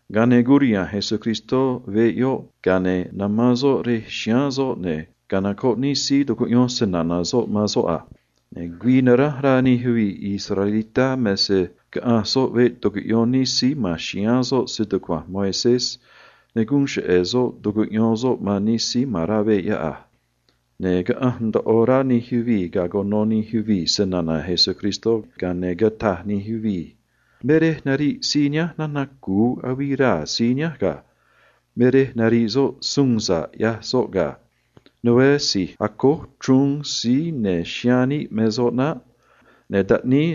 Ga̱a ne̱ curiha̱nj Jesús rej yoꞌ, ga̱a ne̱ namán soꞌ rej chiháán soꞌ, ne̱ canocoꞌ nij síí tucuꞌyón snana̱ soꞌ man soꞌ a. Ne̱ ga̱a quisíj güii naránj rá nij yuvii̱ israelitá me se caꞌanj soꞌ veꞌ tucuꞌyón nij síí ma̱n chiháán soꞌ stucua̱nj Moisés, ne̱ guun cheꞌe̱ soꞌ tucuꞌyón soꞌ man nij síí ma̱n rá veꞌ yoꞌ a. Ne̱ caꞌanj ndoꞌo rá nij yuvii̱ ga̱a cuno nij yuvii̱ snana̱ Jesús, ga̱a ne̱ cataj nij yuvii̱ a: ―Me rej nariꞌ síí nihánj nana̱ cu̱u avii raa̱ soꞌ ga̱. Me rej nariꞌ soꞌ se nucua̱j ꞌyaj soꞌ suun sa̱ꞌ noco̱o ga̱. Né si̱j acój chruun me soꞌ naꞌ. Ne̱ taꞌníí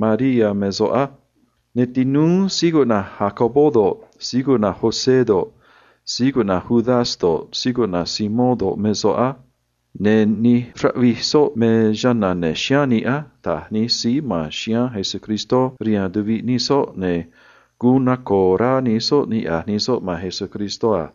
Mariá me soꞌ á. Ne̱ tinúú síí cuꞌna̱j Jacobo do̱ꞌ, José do̱ꞌ, Judas do̱ꞌ, Simón do̱ꞌ, me soꞌ á. Ne̱ nij raꞌvij soꞌ me chana̱ ya̱nj chiháán níꞌ á ―taj nij síí ma̱n chiháán Jesús rihaan tuviꞌ nij soꞌ, ne̱ guun naco̱o̱ rá nij soꞌ niꞌya̱j nij soꞌ man Jesús a.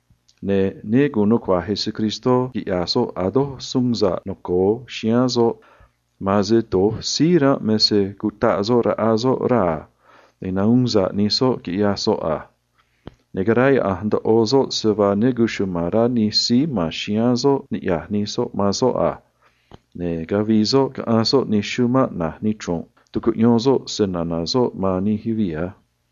Ne̱ ne gu̱un nucua̱j Jesús quiꞌya̱j soꞌ a̱ doj suun sa̱ꞌ noco̱o chiháán soꞌ, ma̱an se do̱j síí ranꞌ me se cutaꞌ soꞌ raꞌa soꞌ raa̱ ne̱ nahuun sa̱ꞌ nij soꞌ, quiꞌyaj soꞌ a. Ne̱ caráyaꞌa̱nj ndoꞌo soꞌ se vaa ne cuchuma̱n rá nij síí ma̱n chiháán soꞌ niꞌya̱j nij soꞌ man soꞌ a. Ga̱a ne̱ cavii soꞌ caꞌanj soꞌ nij chumanꞌ na̱j nichru̱nꞌ, tucuꞌyón soꞌ snana̱ soꞌ man nij yuvii̱ a.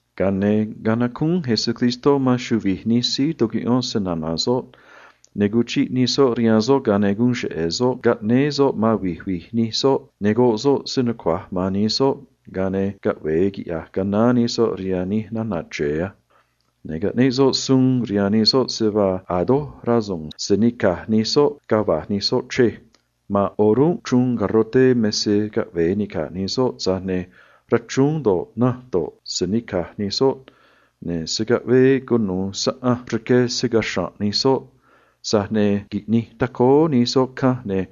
Ga̱a ne̱ canacúún Jesús man chuvi̱j nij síí tucuꞌyón snana̱ soꞌ, ga̱a ne̱ guun cheꞌe̱ soꞌ caꞌnéé soꞌ man vi̱j vi̱j nij soꞌ, ne̱ rqué soꞌ se nucua̱j man nij soꞌ, ga̱a ne̱ caꞌve̱e quiꞌya̱j canaán nij soꞌ rihaan nij nana̱ chre̱e a. Ne̱ caꞌneꞌ soꞌ suun rihaan nij soꞌ se vaa a̱ doj rasu̱u̱n se̱ nica̱j nij soꞌ ga̱a va̱j nij soꞌ chrej maꞌ. Ma̱an o̱rúnꞌ chruun garroté me se caꞌve̱e ni̱caj nij soꞌ, tza̱j ne̱ rachrúún do̱ꞌ, nanj do̱ꞌ, se̱ nica̱j nij soꞌ, ne̱ se̱ caꞌvee cu̱nuû saꞌanj rque marque̱ numi̱i catuu̱n nij soꞌ maꞌ. Tza̱j ne̱ qui̱ꞌnij tacóó nij soꞌ canj, ne̱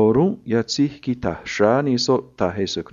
o̱rúnꞌ yatzéj quita̱j xráá nij soꞌ, taj Jesús a.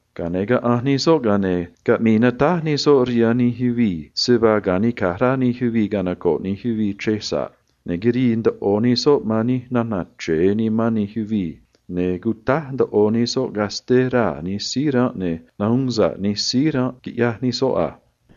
Ga̱a ne̱ caꞌanj nij soꞌ, ga̱a ne̱ caꞌmii natáj nij soꞌ rihaan nij yuvii̱ se vaa nuchra̱nꞌ nimán nij yuvii̱ ne̱ ta̱náj nij yuvii̱ chrej chiꞌi̱i̱ a. Ne̱ quirii ndoꞌo nij soꞌ man nij nana̱ chre̱e nimán nij yuvii̱, ne̱ cutáj ndoꞌo nij soꞌ casté raa̱ nij síí ranꞌ, ne̱ nahuun sa̱ꞌ nij síí ranꞌ, quiꞌyaj nij soꞌ a.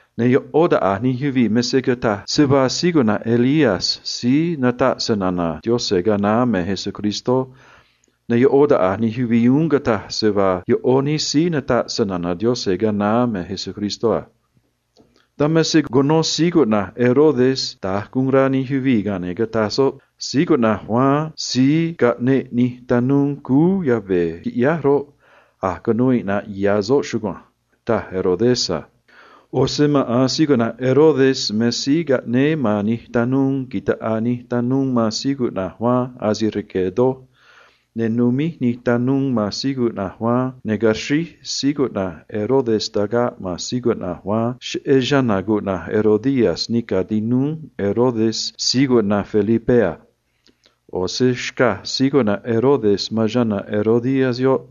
Ne̱ ꞌó taꞌa̱j nij yuvii̱ me se cataj se vaa síí cuꞌna̱j Elías síí nataꞌ snana̱ Yaꞌanj ga̱a naá me Jesús, ne̱ ꞌó taꞌa̱j nij yuvii̱ uún cataj se vaa ase vaa ꞌó nij síí nataꞌ snana̱ Yaꞌanj ga̱a naá me Jesús a. Dan me se cuno Herodes da̱j guun rá nij yuvii̱, ga̱a ne̱ cataj soꞌ a: ―Síí cuꞌna̱j Juan síí caꞌneꞌ nij tanuu cúú yave̱ quiꞌyáj roꞌ, a̱j cunuu iꞌna̱ꞌ ya̱ soꞌ chugua̱nj ―taj soꞌ a. ꞌO̱ se maꞌa̱n Herodes me síí caꞌnéé man nij tanuu ta̱ꞌaa nij tanuu man Juan asi̱j rque̱ doj, ne̱ numíj nij tanuu man Juan, ne̱ caxríj Herodes tagaꞌ man Juan cheꞌé chana̱ cuꞌna̱j Herodías nica̱ tinúú Herodes síí cuꞌna̱j Felipé a. ꞌO̱ se xcaj Herodes man chana̱ Herodías yoꞌ,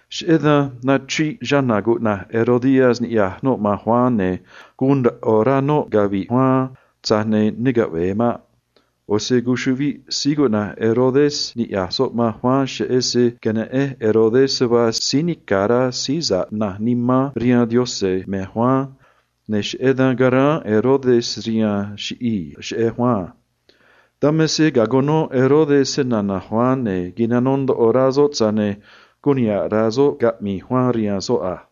Cheꞌé dan nachriꞌ Herodías niꞌya̱j noꞌ man Juan, ne̱ guun ndoꞌo rá noꞌ cavi̱ꞌ Juan, tza̱j ne̱ ne caꞌve̱e maꞌ. ꞌO̱ se cuchuꞌviꞌ Herodes niꞌya̱j soꞌ man Juan, cheꞌé se queneꞌen Herodes se vaa síí nica̱ rá síí sa̱ꞌ nimán rihaan Yaꞌanj me Juan, ne̱ cheꞌé dan caráán Herodes rihaan se chiꞌi̱i̱ cheꞌé Juan a. Dan me se ga̱a cuno Herodes snana̱ Juan, ne̱ nitunj ndoꞌo nimán soꞌ, tza̱j ne̱ guun niha̱ꞌ rá soꞌ caꞌmi̱i̱ Juan rihaan soꞌ a.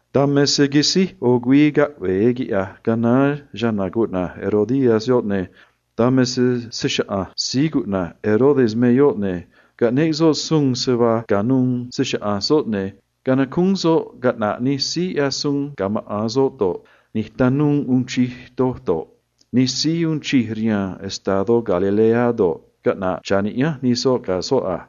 Dan me se quisíj ꞌo̱ güii caꞌve̱e quiꞌya̱j canaán Herodías, ne̱ dan me se se‑chaꞌa̱nj Herodes me yoꞌ, ne̱ caꞌneꞌ soꞌ suun se vaa ca̱nuû se‑chaꞌa̱nj soꞌ, ne̱ canacúún soꞌ caꞌna̱ꞌ nij síí ꞌyaj suun ga̱ maꞌa̱n soꞌ do̱ꞌ, nij tanuu uun chij doj do̱ꞌ, nij síí uun chij rihaan estadó Galilea do̱ꞌ, caꞌna̱ꞌ cha̱ niꞌyánj nij soꞌ ga̱ soꞌ a.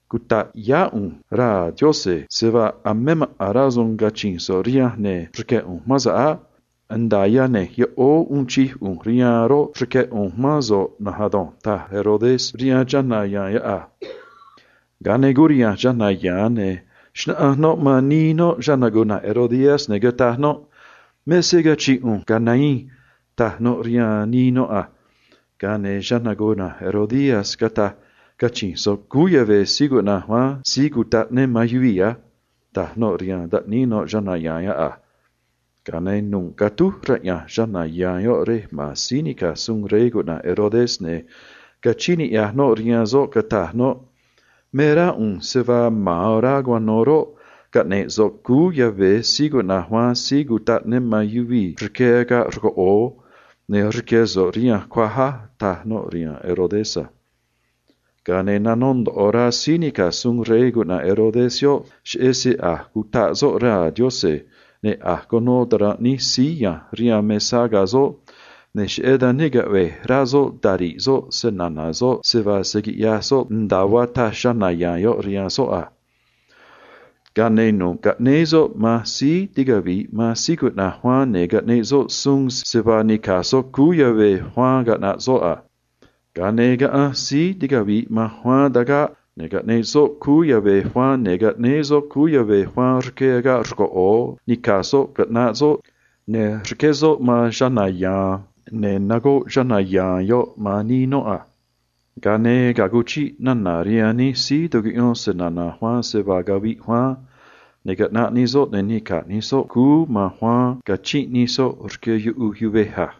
Cuta̱ꞌ yá ꞌu̱nj raa̱ Yaꞌanj se vaa a̱ me maꞌa̱n rasu̱u̱n cachi̱nj so̱ꞌ rihanj, ne̱ rque̱ ꞌu̱nj mán so̱ꞌ á. Nda̱a yane̱j yoꞌóó uun chij ꞌu̱nj rihaan roꞌ, rque̱ ꞌu̱nj mán so̱ꞌ na̱nj ado̱nj ―taj Herodes a. Ga̱a ne̱ curiha̱nj chana̱ ya̱a̱n, ne̱ xnáꞌanj noꞌ man nii noꞌ, ne̱ cataj noꞌ a: ―Me se cachi̱nj ꞌu̱nj, ga̱ nahiin ―taj noꞌ rihaan nii noꞌ a. Ga̱a ne̱ cataj nii noꞌ a: ―Cachi̱nj so̱ꞌ cúú yave̱ Juan Síí Cutaꞌ Ne man yuvii̱ á ―taj noꞌ rihaan taꞌníí noꞌ a. Ga̱a ne̱ nu̱ꞌ catúj raꞌya̱nj chana̱ ya̱a̱n yoꞌ rej ma̱n síí nica̱j suun rey Herodes, ne̱ cachíín niꞌya̱j noꞌ rihaan soꞌ, cataj noꞌ a: ―Me rá ꞌu̱nj se vaa ma̱an orá cuano̱ roꞌ, caꞌne̱j so̱ꞌ cúú yave̱ Juan Síí Cutaꞌ Ne man yuvii̱ rque agaꞌ rcoꞌo̱o, ne̱ rque̱ so̱ꞌ rihanj cuaj á ―taj noꞌ a. Ga̱a ne̱ nanó ndoꞌo rá síí nica̱j suun rey se vaa cachíín noꞌ man soꞌ, tza̱j ne̱ cheꞌé se a̱j cutaꞌ soꞌ raa̱ Yaꞌanj ne̱ a̱j cuno ta̱ranꞌ nij síí ya̱nj rihaan mesá ga̱ soꞌ, ne̱ cheꞌé dan ne caꞌve̱j rá soꞌ tari̱ꞌ soꞌ snana̱ soꞌ se vaa se̱ quiꞌyaj soꞌ nda̱a vaa taj chana̱ ya̱a̱n yoꞌ rihaan soꞌ a. Ga̱a ne̱ nu̱ꞌ caꞌnéé soꞌ man tanuu ticavi̱ꞌ man Juan, ne̱ caꞌneꞌ soꞌ suun se vaa ni̱caj tanuu cúú yave̱ Juan caꞌna̱ꞌ soꞌ a. Ga̱a ne̱ caꞌanj tanuu tagaꞌ, ne̱ caꞌneꞌ soꞌ cúú yave̱ Juan, ne̱ caꞌnéé soꞌ cúú yave̱ Juan rque agaꞌ rcoꞌo̱o, nica̱j soꞌ, caꞌnaꞌ soꞌ, ne̱ rqué soꞌ man chana̱ ya̱a̱n, ne̱ nagoꞌ chana̱ ya̱a̱n yoꞌ man nii noꞌ a. Ga̱a ne̱ ga̱a cuchiꞌ nana̱ rihaan nij síí tucuꞌyón snana̱ Juan se vaa caviꞌ Juan, ne̱ caꞌnaꞌ nij soꞌ, ne̱ nica̱j nij soꞌ cúú man Juan, cachinꞌ nij soꞌ rque yuꞌuj yuvej a.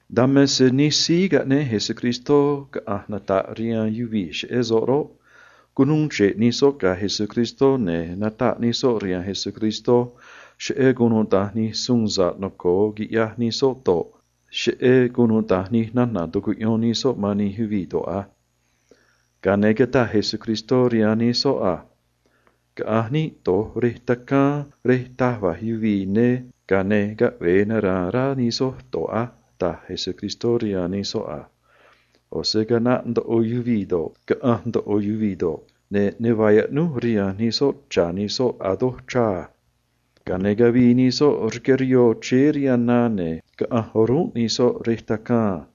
Dan me se nij síí cuneꞌ Jesús caꞌa̱nj nata̱ꞌ snana̱ soꞌ roꞌ, cunuu chre̱ꞌ nij soꞌ ga̱ Jesús, ne̱ nataꞌ nij soꞌ rihaan soꞌ cheꞌé nu̱ꞌ se vaa quiꞌyaj nij soꞌ do̱ꞌ, cheꞌé cunuda̱nj nij nana̱ tucuꞌyón nij soꞌ man nij yuvii̱ do̱ꞌ a. Ga̱a ne̱ cataj Jesús rihaan nij soꞌ a: ―Caꞌa̱nj níꞌ do̱j rej taj va̱j yuvii̱, ga̱a ne̱ caꞌve̱e nara̱a̱n rá nij soj do̱j á ―taj Jesús a. ꞌO̱ se caꞌnaꞌ ndoꞌo yuvii̱ do̱ꞌ, caꞌanj ndoꞌo yuvii̱ do̱ꞌ, ne̱ a̱ ne vaa yaꞌnúj rihaan nij soꞌ cha̱ nij soꞌ a. Ga̱a ne̱ cavii nij soꞌ rque rihoo chéé rihaan na, ne̱ caꞌanj o̱rúnꞌ nij soꞌ ꞌo̱ rej taj va̱j yuvii̱ a.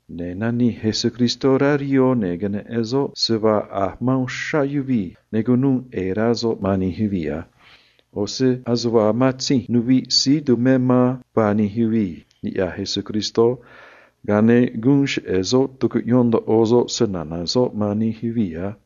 Ne̱ nanij Jesús rá rihoo, ne̱ queneꞌen soꞌ se vaa a̱j ma̱n ri̱i̱ uxrá yuvii̱, ne̱ cunuu ꞌe̱e̱ rá soꞌ niꞌya̱j soꞌ man nij yuvii̱ a. ꞌO̱ se ase vaa matzinj nuviꞌ síí tumé man vaa nij yuvii̱, niꞌya̱j Jesús, ga̱a ne̱ guun cheꞌe̱ soꞌ tucuꞌyón ndoꞌo soꞌ snana̱ soꞌ man nij yuvii̱ a.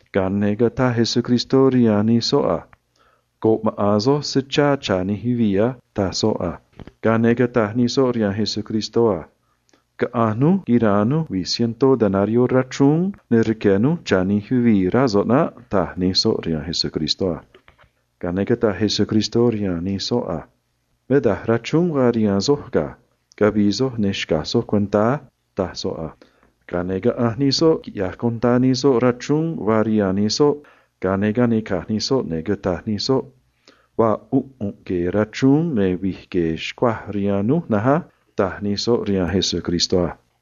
Ga̱a ne̱ cataj Jesús rihaan nij soꞌ a: ―Rque̱ maꞌa̱n soj se chá cha̱ nij yuvii̱ á ―taj soꞌ a. Ga̱a ne̱ cataj nij soꞌ rihaan Jesús a: ―Caꞌa̱nj núj go̱ꞌ núj saꞌanj vaa tuꞌvee yuvii̱ ꞌyaj suun tu̱nj yavii ne̱ quira̱a̱n núj rachrúún, ne̱ rque̱ núj cha̱ nij yuvii̱, rá so̱ꞌ a̱ naꞌ ―taj nij soꞌ a. Ga̱a ne̱ cataj Jesús rihaan nij soꞌ a: ―Me daj rachrúún vaa rihaan soj ga̱. Caꞌa̱nj soj, ne̱ xca̱j soj cuentá á ―taj soꞌ a. Quisíj quiꞌyaj nij soꞌ da̱nj, ga̱a ne̱ canica̱j nij soꞌ, ne̱ cataj nij soꞌ a: ―Vaa ꞌu̱nꞌ rachrúún ne̱ vi̱j gue̱e̱ xcuaj rihaan núj na̱nj á ―taj nij soꞌ a.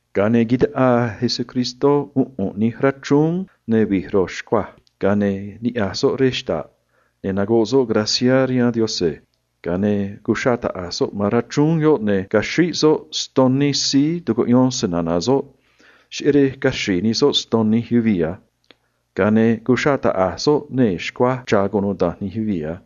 Ga̱a ne̱ taꞌaa Jesús ꞌu̱nꞌ nij rachrúún ne̱ vi̱j ro̱j xcuaj, ga̱a ne̱ niꞌya̱j soꞌ rej xta̱ꞌ, ne̱ cataj soꞌ guun niꞌya̱j níꞌ rihaan Yaꞌanj, ga̱a ne̱ cuxraꞌ taꞌa̱j soꞌ man rachrúún yoꞌ, ne̱ caxríj soꞌ ston nij síí tucuꞌyón snana̱ soꞌ, cheꞌé rej caxri̱i̱ nij soꞌ ston nij yuvii̱ a. Ga̱a ne̱ cuxraꞌ taꞌa̱j soꞌ nee̱ xcuaj cha̱ cunuda̱nj nij yuvii̱ a.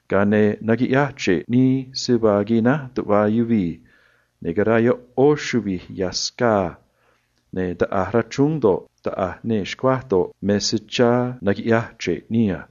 Ga̱a ne̱ naquiꞌyaj chre̱ꞌ nij síí tucuꞌyón snana̱ soꞌ se vaa quináj tuꞌva yuvii̱, ne̱ caraa chuvi̱j ya̱ scaa rachrúún do̱ꞌ, nee̱ xcuaj do̱ꞌ a.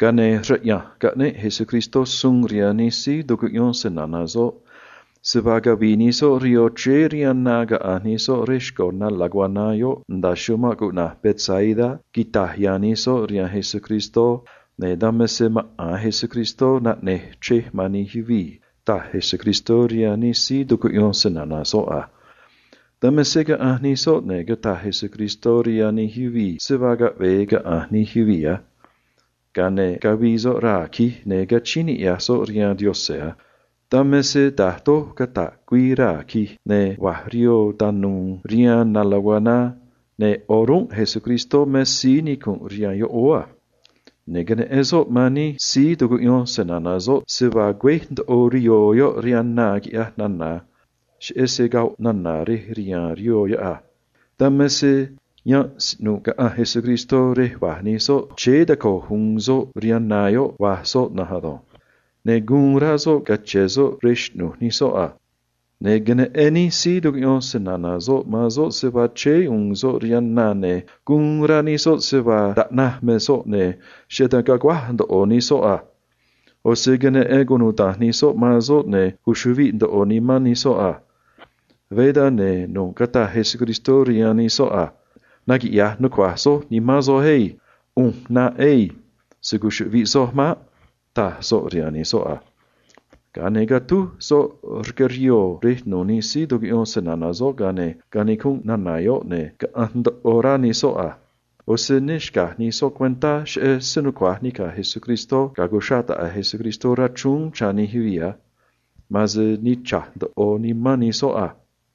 Ga̱a ne̱ raꞌya̱nj caꞌneꞌ Jesús suun rihaan nij síí tucuꞌyón snana̱ soꞌ se vaa cavi̱i̱ nij soꞌ rihoo chéé rihaan na caꞌa̱nj nij soꞌ rej xco̱ na laguaná yoꞌ nda̱a chumanꞌ Betsaida, quita̱j ya̱a̱n nij soꞌ rihaan soꞌ a. Dan me se maꞌa̱n Jesús naꞌne̱j chrej man nij yuvii̱ ri̱i̱ yoꞌ, taj Jesús a. Dan me se caꞌanj nij soꞌ, ne̱ cataj Jesús rihaan nij yuvii̱ se vaa caꞌve̱e caꞌa̱nj nij yuvii̱ a. Ga̱a ne̱ cavii soꞌ raa̱ tacaan cachi̱nj niꞌya̱j soꞌ rihaan Yaꞌanj a. Dan me se ga̱a da̱j doj cata̱ꞌ güii, ne̱ va̱j rihoo tanu̱u̱ rihaan na laguaná, ne̱ o̱rúnꞌ maꞌa̱n Jesús nicunꞌ rihaan yoꞌóó a. Ne̱ queneꞌen soꞌ man nij síí tucuꞌyón snana̱ soꞌ se vaa sayu̱u̱n tacuachéé nij soꞌ rihoo rihaan na cheꞌé se goꞌ nana̱ rej riha̱a̱n rihoo a. Dan me se rej rá ranga̱ꞌ caꞌanj Jesús rej va̱j nij soꞌ, chéé taco̱j u̱u̱n soꞌ rihaan na, va̱j soꞌ na̱nj ado̱nj. Ne̱ guun rá soꞌ gu̱un ya̱a̱n soꞌ rihaan nij soꞌ a. Ne̱ queneꞌen nij síí tucuꞌyón snana̱ soꞌ man soꞌ se vaa chéé u̱u̱n soꞌ rihaan na, ne̱ guun rá nij soꞌ se vaa taꞌnaj me soꞌ, ne̱ cheꞌé dan caguáj ndoꞌo nij soꞌ a. ꞌO̱ se queneꞌen cunuda̱nj nij soꞌ man soꞌ, ne̱ cuchuꞌviꞌ ndoꞌo nimán nij soꞌ a. Veé dan, ne̱ nu̱ꞌ cataj Jesús rihaan nij soꞌ a: ―Naquiꞌya̱j nucua̱j soj nimán soj á. ꞌU̱nj ꞌnaꞌ ado̱nj. Se̱ cuchuꞌviꞌ soj maꞌ ―taj soꞌ a. Ga̱a ne̱ catúj soꞌ rque rihoo rej nu̱u̱ nij síí tucuꞌyón snana̱ soꞌ, ga̱a ne̱ canicunꞌ nana̱ yoꞌ, ne̱ caꞌanj ndoꞌo rá nij soꞌ a. ꞌO̱ se ne xca̱j sa̱ꞌ nij soꞌ cuentá cheꞌé se nucua̱j nica̱j Jesús ga̱a cuxraꞌ taꞌa̱j Jesús rachrúún chá nij yuvii̱ a. Ma̱an se nichra̱j ndoꞌo nimán nij soꞌ a.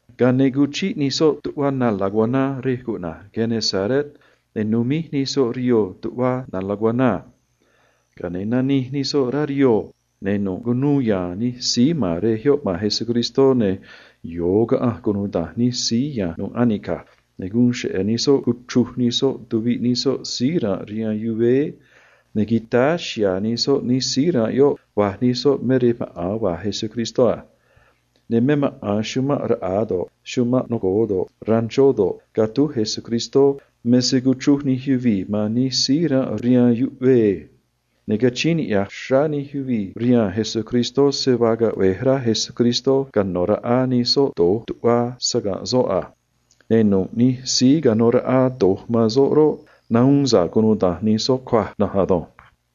Ga̱a ne̱ cuchiꞌ nij soꞌ tuꞌva na laguaná rej cuꞌna̱j Genesaret, ne̱ numíj nij soꞌ rihoo tuꞌva na laguaná a. Ga̱a ne̱ nanij nij soꞌ rá rihoo, ne̱ nu̱ꞌ cunuu ya̱a̱n nij síí ma̱n rej yoꞌ man Jesús a. Ne̱ yo̱o caꞌanj nij soꞌ, ne̱ guun cheꞌe̱ nij soꞌ cuchruj nij soꞌ tuviꞌ nij soꞌ síí ranꞌ rihaan yuvéé, ne̱ quitáá chihá nij soꞌ nij síí ranꞌ yoꞌ, va̱j nij soꞌ me rej maꞌa̱n va̱j Jesús a. Ne̱ me maꞌa̱n chumanꞌ raꞌa̱ do̱ꞌ, chumanꞌ noco̱o do̱ꞌ, ranchó do̱ꞌ, catúj Jesús me se cuchruj nij yuvii̱ man nij síí ranꞌ rihaan yuꞌvee a. Ne̱ rquee̱ nij yuvii̱ man Jesús se vaa caꞌve̱j rá Jesús cano̱ raꞌa nij soꞌ do̱j tuꞌva saga̱nꞌ soꞌ a. Ne̱ nu̱ꞌ nij síí canó raꞌa do̱j man soꞌ roꞌ, nahuun sa̱ꞌ cunuda̱nj nij soꞌ cuaj na̱nj ado̱nj.